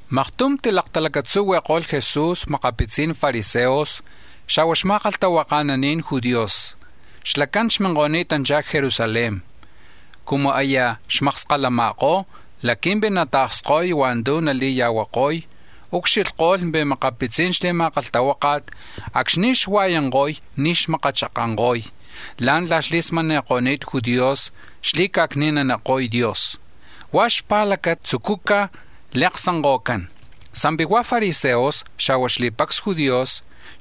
Maktum tilaktalacatzuhui̱ko̱lh Jesús makapitzi̱n fariseos, xa̱hua̱ xma̱kalhtahuaka̱nani̱n judíos, xlacán xminko̱ni̱tanchá̱ c-Jerusalén. Cumu aya xmakskalama̱kó̱ laqui̱mpi̱ nata̱ksko̱y hua̱ntu̱ nali̱ya̱huako̱y, ucxilhko̱lh pi̱ makapitzi̱n xli̱ma̱kalhtahuáka̱t, acxni̱ xua̱yanko̱y, ni̱ xmakachakanko̱y la̱ntla̱ xli̱smani̱ko̱ni̱t judíos xli̱ca̱cni̱naniko̱y Dios, huá̱ xpa̱lacata tzucúcaj li̱aksanko̱cán. Sa̱mpi̱ hua̱ fariseos, xa̱hua̱ xli̱pacs Judíos,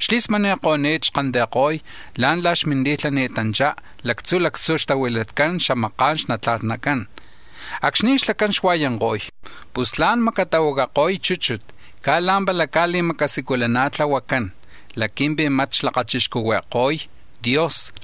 xli̱smani̱ko̱ni̱t xquilhtiyako̱y la̱ntla̱ xminti̱lhani̱tanchá̱ lactzu̱ lactzu̱ xtahuilatcán xamaka̱n xnatla̱tnacán. Acxni̱ xlacán xua̱yanko̱y, pu̱lh tla̱n namacatahuacako̱y chúchut caj la̱mpala cali̱macasiculana̱tlahuacán laqui̱mpi̱ mat xlakachixcuhui̱ko̱y Dios.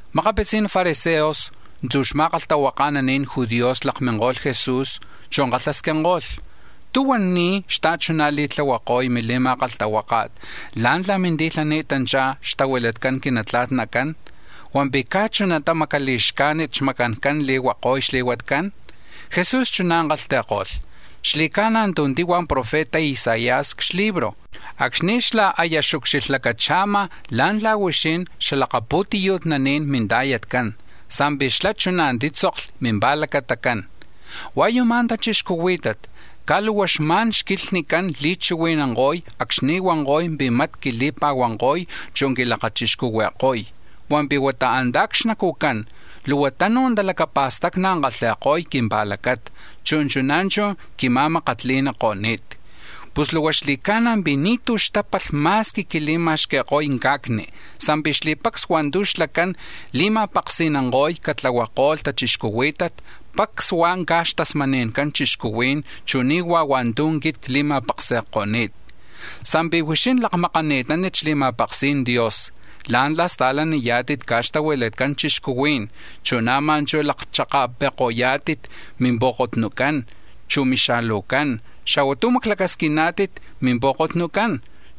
Makapitzi̱n fariseos, chu̱ xma̱kalhtahuaka̱nacan judíos lakminko̱lh Jesús, chu̱ kalhasquinko̱lh: —¿Tú̱huan ni̱ xta̱chuná̱ li̱tlahuako̱y mili̱ma̱kalhtahuáka̱t la̱ntla̱ minti̱lhani̱tanchá̱ xtahuilatcan quinatla̱tnacán, hua̱mpi̱ caj chunata macali̱xcajnit xmacancán li̱huako̱y xli̱huatcán? Jesús chuná̱ kalhti̱ko̱lh: —Xli̱ca̱na̱ tu̱ tihua̱ profeta Isaías c-xlibro̱ acxni̱ xlá̱ aya xucxilhlacacha̱ma̱ la̱ntla̱ huixín xalakapu̱tiyu̱tnani̱n minta̱yatcán, sa̱mpi̱ xlá̱ chuná̱ títzokli̱ mimpa̱lacatacán: ‘Hua̱ yuma̱ tachixcuhuí̱tat, caj luhua xma̱n xquilhnicán li̱chihui̱nanko̱y acxni̱ huanko̱y pi̱ mat quili̱pa̱huanko̱y, chú quilakachixcuhui̱ko̱y, hua̱mpi̱ huata antá̱ c-xnacu̱cán luhua tunu̱ talacapa̱stacni̱ kalhi̱ko̱y quimpa̱lacata, chu̱ chuná̱ chú̱ quima̱makatli̱niko̱ni̱t.’ Pus luhua xli̱ca̱na̱ pi̱ ni̱tu̱ xtápalh ma̱squi quili̱ma̱xqui̱ko̱y ca̱cni, sa̱mpi̱ xli̱pacs hua̱ntu̱ xlacán li̱ma̱paksi̱nanko̱y catlahuako̱lh tachixcuhuí̱tat pacs huá̱ caj xtasmani̱ncan chixcuhuí̱n, chu̱ ni̱ huá̱ hua̱ntu̱ quit cli̱ma̱paksi̱ko̱ni̱t. Sa̱mpi̱ huixín lakmakaná̱tit xli̱ma̱paksi̱n Dios la̱ntla̱ sta̱laniyá̱tit caj xtahuilatcan chixcuhuí̱n, chu̱ na̱maj chú̱ lakchaka̱pi̱ko̱yá̱tit mimpu̱kotnucán, chu̱ mixalujcán, xa̱hua̱ tu̱ maclacasquiná̱tit mimpu̱kotnucán,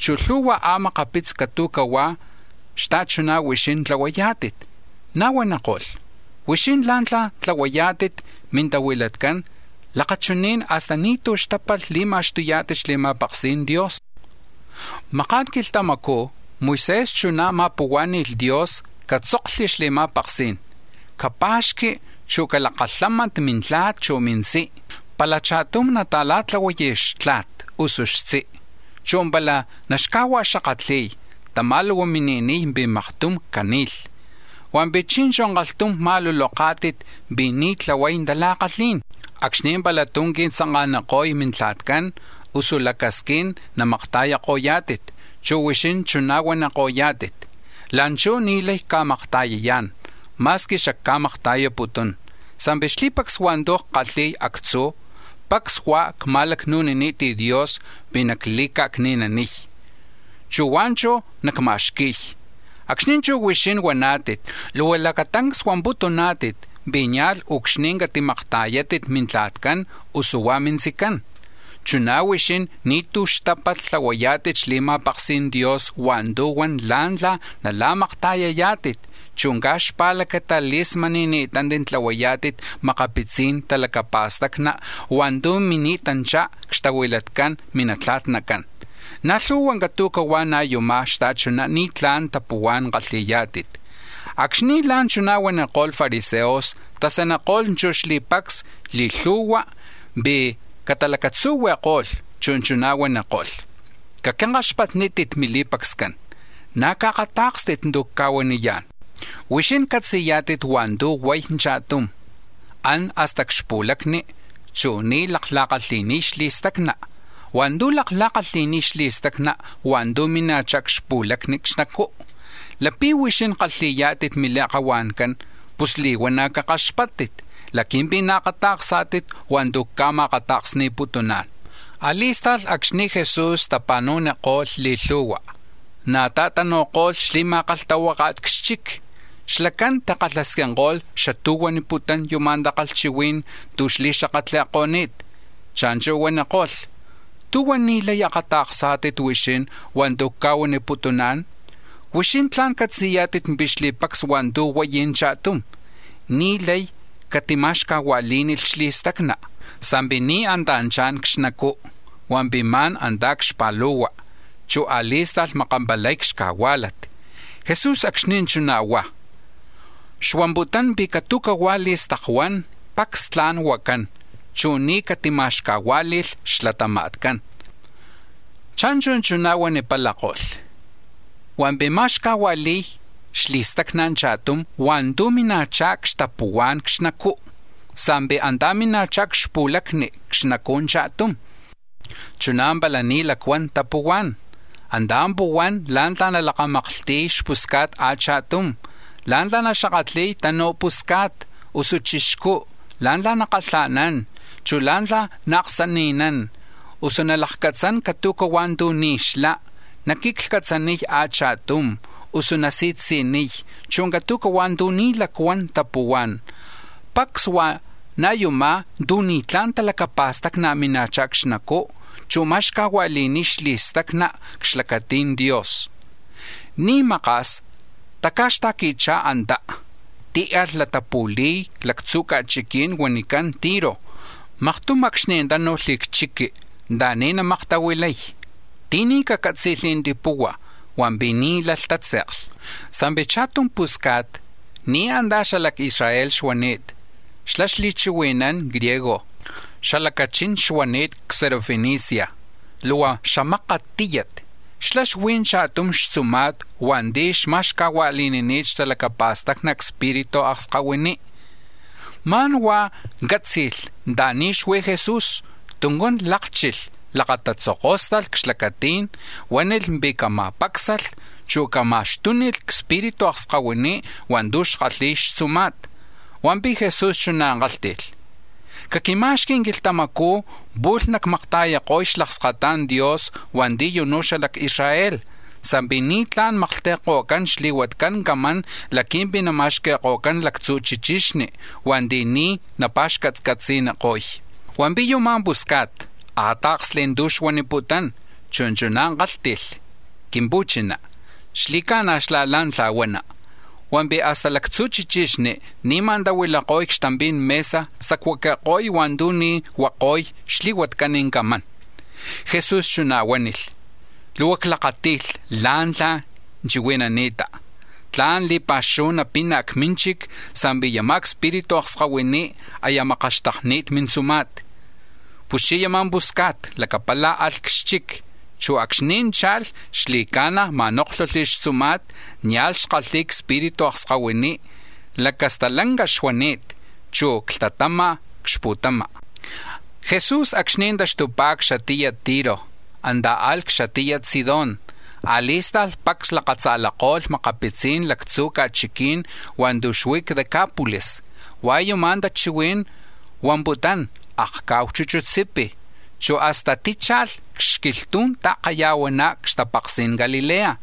chu̱ lhu̱hua̱ a̱makapitzi̱ catu̱hua̱ xta̱chuná̱ huixín tlahuayá̱tit. Na̱ huaniko̱lh: —Huixín la̱ntla̱ tlahuayá̱tit mintahuilatcán lakachuní̱n hasta ni̱tú̱ xtápalh li̱ma̱xtuyá̱tit xli̱ma̱paksi̱n Dios. Maká̱n quilhtamacú̱ Moisés chuná̱ ma̱puhuá̱ni̱lh Dios catzoklhi̱ xli̱ma̱paksí̱n: ‘Capa̱xqui, chu̱ calakalhámanti̱ mintla̱t, chu̱ mintzí. Pala cha̱tum nata̱la̱tlahuay xtla̱t, usu xtzi, chu̱ pala naxcajua̱xakatli̱y, tamá̱ luhua mini̱niy pi̱ maktum cani̱lh.’ Hua̱mpi̱ chi̱nchu̱ kalhtum ma̱luloká̱tit pi̱ ni̱ tlahuay talakalhí̱n acxni̱ pala tú̱ qui̱tzanka̱niko̱y mintla̱tcán, usu lacasquín namakta̱yako̱yá̱tit, chu̱ huixín chuná̱ nahuaniko̱yá̱tit: ‘La̱nchú̱ ni̱ lay cca̱makta̱yayá̱n ma̱squi xacca̱makta̱yaputún, sa̱mpi̱ xli̱pacs hua̱ntu̱ ckalhi̱y actzú̱, pacs huá̱ cma̱lacnu̱nini̱t Dios pi̱ nacli̱ca̱cni̱naniy, chu̱ huá̱ chú̱ nacma̱xqui̱y.’ Acxni̱ chuná̱ huixín huaná̱tit, luhua lacatancs huamputuná̱tit pi̱ nia̱lh niucxni̱ catimakta̱yátit mintla̱tcán, usu hua̱ mintzicán. Chuná̱ huixín ni̱tú̱ xtapalh tlahuayá̱tit xli̱ma̱paksi̱n Dios hua̱ntu̱ huan la̱ntla̱ nala̱makta̱yayá̱tit, caj xpa̱lacata li̱smani̱ni̱tántit tlahuayá̱tit makapitzi̱n talacapa̱stacni̱ hua̱ntu̱ mini̱tanchá̱ xtahuilatcan minatla̱tnacán. Na̱ lhu̱hua̱ catu̱huá̱ ná̱ yuma̱ xta̱chuná̱ ni̱tla̱n tapuhuá̱n kalhi̱yá̱tit. Acxni̱ la̱nchuná̱ huaniko̱lh fariseos, tasaniko̱lh chú̱ xli̱pacs li̱lhu̱hua̱ pi̱ catalacatzuhui̱ko̱lh, chu̱ chuná̱ huaniko̱lh: —Caquinkaxpatnítit mili̱pacscán, na̱ caakatá̱kstit tu̱ nacca̱huaniyá̱n. Huixín catzi̱yá̱tit hua̱ntu̱ huay cha̱tum, an hasta c-xpu̱lacni, chu̱ ni̱ lakla̱kalhi̱niy xli̱stacna, hua̱ntu̱ lakla̱kalhi̱niy xli̱stacna hua̱ntu̱ mina̱chá̱ c-xpu̱lacni xnacú̱. ¡Lapi̱ huixín kalhi̱yá̱tit mintake̱ncán pus li̱huana̱ cakaxpáttit laqui̱mpi̱ naakata̱ksá̱tit hua̱ntu̱ cca̱ma̱akata̱ksni̱putuná̱n! A̱li̱sta̱lh acxni̱ Jesús tapa̱nu̱niko̱lh li̱lhu̱hua, na̱ ta̱tanu̱ko̱lh xli̱ma̱kalhtahuáka̱t c-xchic, xlacán tikalhasquinko̱lh xatú̱ xuaniputún yama̱ takalhchihuí̱n tu̱ xli̱xakatli̱ko̱ni̱t. Cha̱nchu̱ huaniko̱lh: —¿Tú̱huan ni̱ lay akata̱ksá̱tit huixín hua̱ntu̱ cca̱huaniputuná̱n? Huixín tla̱n catzi̱yá̱tit pi̱ xli̱pacs hua̱ntu̱ huay cha̱tum, ni̱ lay catima̱xcajua̱lí̱nilh xli̱stacna, sa̱mpi̱ ni̱ antá̱ cha̱n c-xnacú̱, hua̱mpi̱ ma̱n antá̱ c-xpa̱lu̱hua, chu̱ a̱li̱sta̱lh makampalay c-xcajuá̱lat. Jesús acxni̱ chuná̱ huá̱, xuamputún pi̱ catu̱hua̱ tu̱ huacán, pacs tla̱n huacán, chu̱ ni̱ catima̱xcajuá̱li̱lh xlatama̱tcán. Cha̱nchu̱ chuná̱ huanipalako̱lh: —Hua̱mpi̱ ma̱xcajua̱li̱y xli̱stacna cha̱tum hua̱ntu̱ mina̱chá̱ xtapuhuá̱n c-xnacú̱. Sa̱mpi̱ antá̱ mina̱chá̱ c-xpu̱lacni, c-xnacu̱ cha̱tum, chuná̱ pala ni̱ lacuán tapuhuá̱n; antá̱ puhuán la̱ntla̱ nalakamaklhti̱y xpusca̱t achatum, la̱ntla̱ naxakatli̱y tanuj pusca̱t, usu chixcú, chu̱ la̱mákni̱t, la̱ntla̱ nakalha̱nán, chu̱ la̱ntla̱ naaksani̱nán, usu nalakcatzán catu̱huá̱ tu̱ ni̱ xlá, naquiclhcatzaniy a̱chatum, usu nasitziniy, chu̱ catu̱huá̱ tu̱ ni̱ lacuan tapuhuá̱n. Pacs hua̱ na̱ yumá̱ tu̱ ni̱tla̱n talacapa̱stacni̱ mina̱chá̱ c-xnacú, chu̱ ma̱xcajua̱li̱niy xli̱stacna c-xlacati̱n Dios. Ni̱ li̱maka̱s, taca̱xta̱qui̱chá̱ antá, tíalh latapu̱li̱y lacatzú̱ ca̱chiquí̱n huanicán Tiro chu̱ Sidón. Maktum acxni̱ tánu̱lh c-chiqui̱ anta̱ni̱ namaktahuilay, ti̱ni̱ cacátzi̱lh tipuhua̱, hua̱mpi̱ ni̱ lay tátze̱kli. Sa̱mpi̱ cha̱tum pusca̱t, ni̱ antá̱ xala c-Israel xuani̱t, xlá̱ xli̱chihui̱nán griego, xalacachín xuani̱t c-Sirofenicia, luhua xamakat tíyat. Xlá̱ xuí̱ cha̱tum xtzuma̱t hua̱nti̱ xma̱xcajua̱li̱nini̱t xtalacapa̱stacni cspiritu akskahuiní. Ma̱n huá̱ cátzi̱lh anta̱ni̱ xuí̱ Jesús, tuncán lákchilh, lakatatzokóstalh c-xlacatí̱n, huánilh pi̱ cama̱pácsalh, chu̱ catama̱xtúnilh cspiritu akskahuiní̱ hua̱ntu̱ xkalhi̱y xtzuma̱t. Hua̱mpi̱ Jesús chuná̱ kálhti̱lh: —Caquima̱xqui̱ quilhtamacú̱ pu̱lh cacmakta̱yako̱lh xlakskata̱n Dios hua̱nti̱ yunú̱ xala c-Israel, sa̱mpi̱ ni̱ tla̱n maklhti̱ko̱cán xli̱huatcan camán laqui̱mpi̱ nama̱xqui̱ko̱cán lactzu̱ chichí̱n, hua̱nti̱ ni̱ napa̱xcatcatzi̱niko̱y. Hua̱mpi̱ yama̱ pusca̱t akáta̱ksli̱ tu̱ xuaniputún, chu̱ chuná̱ kálhti̱lh: —Quimpuchiná, xli̱ca̱na̱ xlá̱ la̱ntla̱ huana, hua̱mpi̱ hasta lactzu̱ chichixni ni̱ma̱ tahuilako̱y c-xtampi̱n mesa sacuaqui̱ko̱y hua̱ntu̱ ni̱ huako̱y xli̱huatcan camán. Jesús chuná̱ huánilh: —Luhua clakáti̱lh la̱ntla̱ chihui̱nani̱ta, tla̱n li̱pa̱xuhu napina̱ c-mínchic sa̱mpi̱ yama̱ cspiritu akskahuiní, aya makaxtakni̱t mintzuma̱t. Puschí̱ yama̱ pusca̱t, lacapala̱ alh c-xchic, chu̱ acxni̱ cha̱lh, xli̱ca̱na̱ ma̱nóklhulh xtzuma̱t, nia̱lh xkalhi̱y cspiritu akskahuiní, lacastalanca xuani̱t, chu̱ clhtatama̱ c-xpu̱tama. Jesús acxni̱ taxtupá̱ c-xatiyat Tiro, antá̱ alh c-xatiyat Sidón, a̱li̱sta̱lh pacs lakatza̱lako̱lh makapitzi̱n lactzu̱ ca̱chiquí̱n hua̱ntu̱ xuí̱ c-Decápolis (hua̱ yuma̱ tachihuí̱n huamputún: “Akca̱hu Chuchutsipi̱”), chu hasta tícha̱lh c-xquilhtu̱n ta̱kaya̱huaná̱ c-xtapaksi̱n Galilea.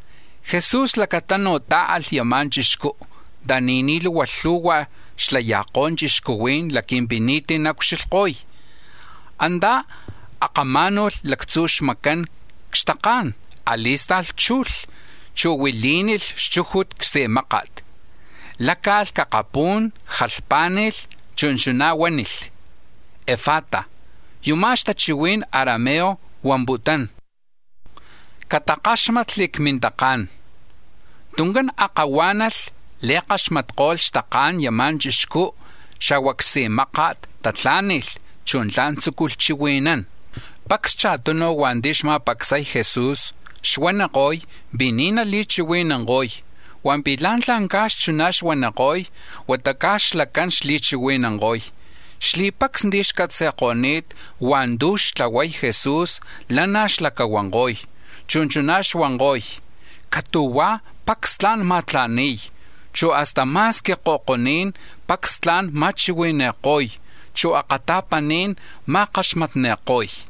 Jesús lacatanu̱ tá̱alh yama̱ chixcú̱ anta̱ni̱ ni̱ luhua lhu̱hua̱ xlaya̱kó̱ chixcuhuí̱n laqui̱mpi̱ ni̱tí̱ naucxilhko̱y. Antá̱ akamá̱nu̱lh lactzu̱ xmacán c-xtaká̱n; a̱li̱sta̱lh chujli, chu̱ huilí̱nilh xchújut csi̱máka̱t. Láca̱lh c-akapú̱n, jalhpá̱ni̱lh, chu̱ chuná̱ huánilh: “¡Efata!” (yuma̱ c-xatachihui̱n arameo huamputún: “¡Catakáxmatli̱ cmintaká̱n!”) Tuncán akahuá̱nalh, li̱kaxmatko̱lh xtaka̱n yama̱ chixcú, xa̱hua̱ csi̱máka̱t tatlá̱ni̱lh, chu̱ tla̱n tzúculh chihui̱nán. Pacs cha̱tunu̱ hua̱nti̱ xma̱pacsay Jesús xuaniko̱y pi̱ ni̱ nali̱chihui̱nanko̱y, hua̱mpi̱ la̱ntla̱ ca̱x chuná̱ xuaniko̱y, huata ca̱x xlacán xli̱chihui̱nanko̱y. Xli̱pacs ti̱ xcatzi̱ko̱ni̱t hua̱ntu̱ xtlahuako̱y Jesús, lanaj xlacahuanko̱y, chu̱ chuná̱ xuanko̱y: “Catu̱huá̱, pacs tla̱n ma̱tla̱ni̱y, chu̱ hasta ma̱squi ko̱koní̱n, pacs tla̱n ma̱chihui̱ni̱ko̱y, chu̱ akata̱paní̱n ma̱akatla̱ni̱ko̱y.”